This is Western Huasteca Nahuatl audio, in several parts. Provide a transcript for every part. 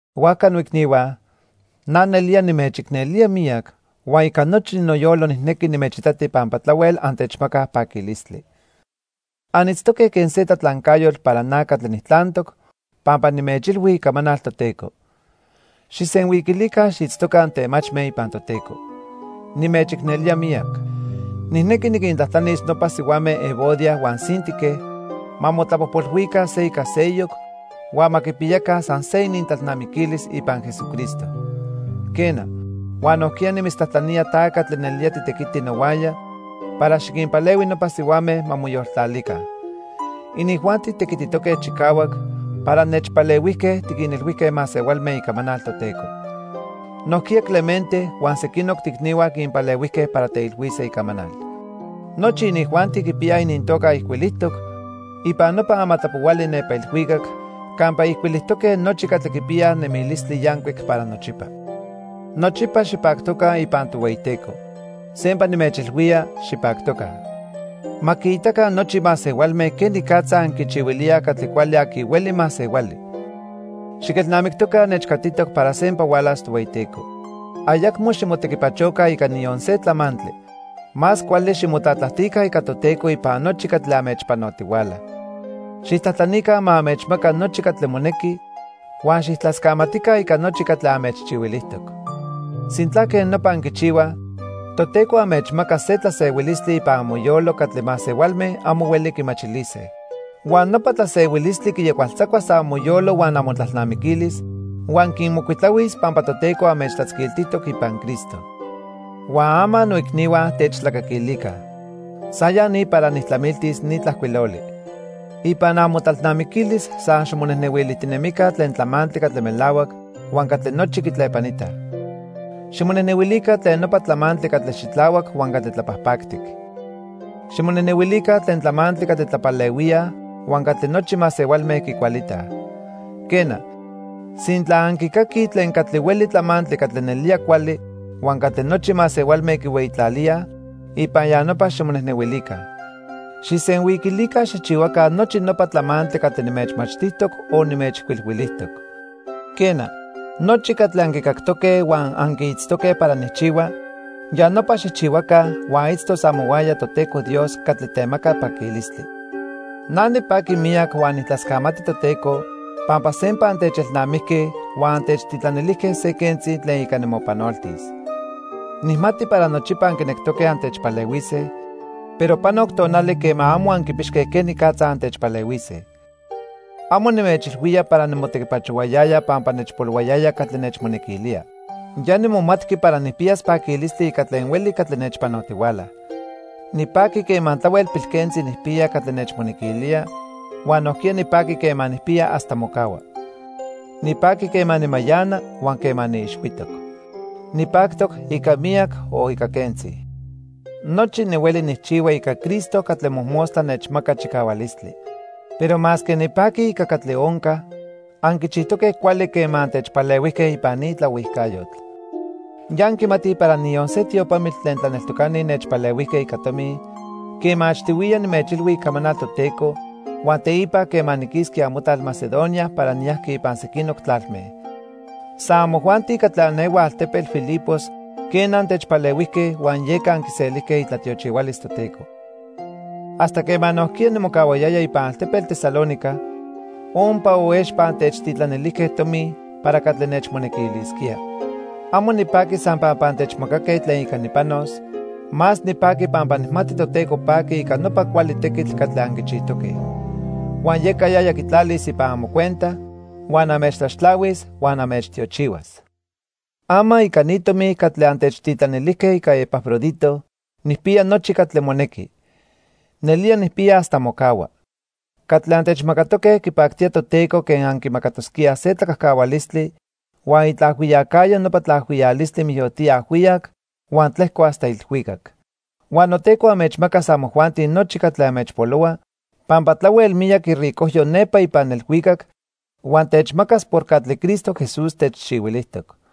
Huajca, noicnihua, na nelía nimechicnelía miyac huan ica nochi noyolo nijnequi nimechitati pampa tlahuel antechmacaj paquilistli. Anitztoque quen se tlatlancayotl para na catli nijtlantoc pampa nimechilhui icamanal Toteco. Xijsenhuiquilica xiitztoca antemachme ipan Toteco. Nimechicnelía miyac. Nijnequi niquintlajtlanis nopa sihuame Evodia huan Síntique ma motlapojpolhuica se ica seyoc huan ma quipiyaca san se inintlalnamiquilis ipan Jesucristo. Quena, huan nojquiya nimitztlajtlanía ta catli nelía titequiti nohuaya para xiquinpalehui nopa sihuame ma moyoltlalica. Inijuanti tequititoque chicahuac para nechpalehuijque tiquinilhuijque masehualme icamanal Toteco. Nojquiya Clemente huan sequinoc toicnihua quinpalehuijque para teilhuise icamanal. Nochi inijuanti quipiyaj inintoca ijcuilijtoc ipan nopa amatlapohuali nepa ilhuicac campa ijcuilijtoque nochi catli quipiyaj nemilistli yancuic para nochipa. Nochipa xipactoca ipan Tohueyiteco. Sempa nimechilhuía, xipactoca. Ma quiitaca nochi masehualme quenicatza anquichihuilíaj catli cuali aqui hueli masehuali. Xiquelnamictoca nechcatitoc para sempa hualas Tohueyiteco. Ayacmo ximotequipachoca ica niyon se tlamantli. Más cuali ximotlatlajtica ica Toteco ipan nochi catli anmechpanotihuala. Xijtlajtlanica ma anmechmaca nochi catli monequi huan xijtlascamatica ica nochi catli anmechchihuilijtoc. Sintla quej nopa anquichihuaj, Toteco anmechmacas se tlasehuilistli ipan amoyolo catli masehualme amo hueli quimachilise. Huan nopa tlasehuilistli quiyahualtzacuas amoyolo huan amotlalnamiquilis huan quinmocuitlahuis pampa Toteco anmechtlatzquiltijtoc ipan Cristo. Huan ama noicnihua, techtlacaquilica. San ya ni para nijtlamiltis ni tlajcuiloli. Ipan amotlalnamiquilis san ximonejnehuilijtinemica tlen tlamantli catli melahuac huan catli nochi quitlepanitaj. Ximonejnehuilica tlen nopa tlamantli catli xitlahuac huan catli tlapajpactic. Ximonejnehuilica tlen tlamantli catli tlapalehuíaj huan catli nochi masehualme quicualitaj. Quena, sintla anquicaquij tlen catli hueli tlamantli catli nelía cuali huan catli nochi masehualme quihueyitlalíaj, ipan ya nopa ximonejnehuilica. Xijsenhuiquilica xijchihuaca nochi nopa tlamantli catli nimechmachtijtoc o nimechijcuilhuilijtoc. Quena, nochi catli anquicactoque huan anquiitztoque para nijchihua, ya nopa xijchihuaca huan itztos amohuaya Toteco Dios catli temaca paquilistli. Na nipaqui miyac huan nijtlascamati Toteco pampa sempa antechelnamijque huan antechtitlanilijque se quentzi tlen ica nimopanoltis. Nijmati para nochipa anquinectoque antechpalehuise, pero panoc tonali quema amo anquipixque quenicatza antechpalehuise. Amo nimechilhuía para nimotequipachohuayaya pampa nechpolohuayaya catli nechmonequilía. Ya nimomatqui para nijpiyas paquilistli ica tlen hueli catli nechpanotihuala. Nipaqui quema tlahuel pilquentzi nijpiya catli nechmonequilía huan nojquiya nipaqui quema nijpiya hasta mocahua. Nipaqui quema nimayana huan quema niixhuitoc. Nipactoc ica miyac o ica quentzi. Nochi nihueli nijchihua ica Cristo catli mojmostla nechmaca chicahualistli. Pero masque nipaqui ica catli onca, anquichijtoque cuali quema antechpalehuijque ipan ni tlaohuijcayotl. Ya anquimatij para niyon se tiopamitl tlen tlaneltocani nechpalehuijque ica tomi quema achtihuiya nimechilhui icamanal Toteco huan teipa quema niquisqui amotlal Macedonia para niyajqui ipan sequinoc tlalme. San amojuanti catli anehuaj altepetl Filipos, quena, antechpalehuijque huan yeca anquiselijque itlatiochihualis Toteco. Hasta quema nojquiya nimocahuayaya ipan altepetl Tesalónica, ompa o expa antechtitlanilijque tomi para catli nechmonequilisquía. Amo nipaqui san pampa antechmacaque tlen ica nipanos, más nipaqui pampa nijmati Toteco paqui ica nopa cuali tequitl catli anquichijtoque. Huan yeca yaya quitlalis ipan amocuenta, huan anmechtlaxtlahuis huan anmechtiochihuas. Ama ica ni tomi catli antechtitlanilijque ica Epafrodito, nijpiya nochi catli monequi. Nelía nijpiya hasta mocahua. Catli antechmacatoque quipactía Toteco quen anquimacatosquíaj se tlacajcahualistli huan itlaajhuiyacayo nopa tlacajcahualistli mijyotía ajhuiyac huan tlejco hasta ilhuicac. Huan Noteco anmechmacas amojuanti nochi catli anmechpolohua pampa tlahuel miyac iricojyo nepa ipan ilhuicac huan techmacas por catli Cristo Jesús techchihuilijtoc.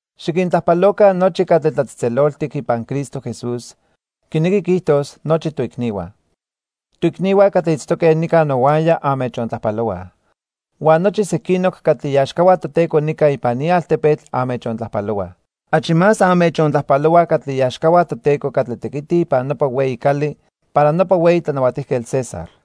Xiquintlajpaloca nochi catli tlatzejtzeloltic ipan Cristo Jesús, quinequi quiijtos nochi toicnihua. Toicnihua catli itztoque nica nohuaya anmechontlajpalohuaj. Huan nochi sequinoc catli iaxcahua Toteco nica ipan ni altepetl anmechontlajpalohuaj. Achi más anmechontlajpalohuaj catli iaxcahua Toteco catli tequitij ipan nopa hueyi cali para nopa hueyi tlanahuatijquetl, César.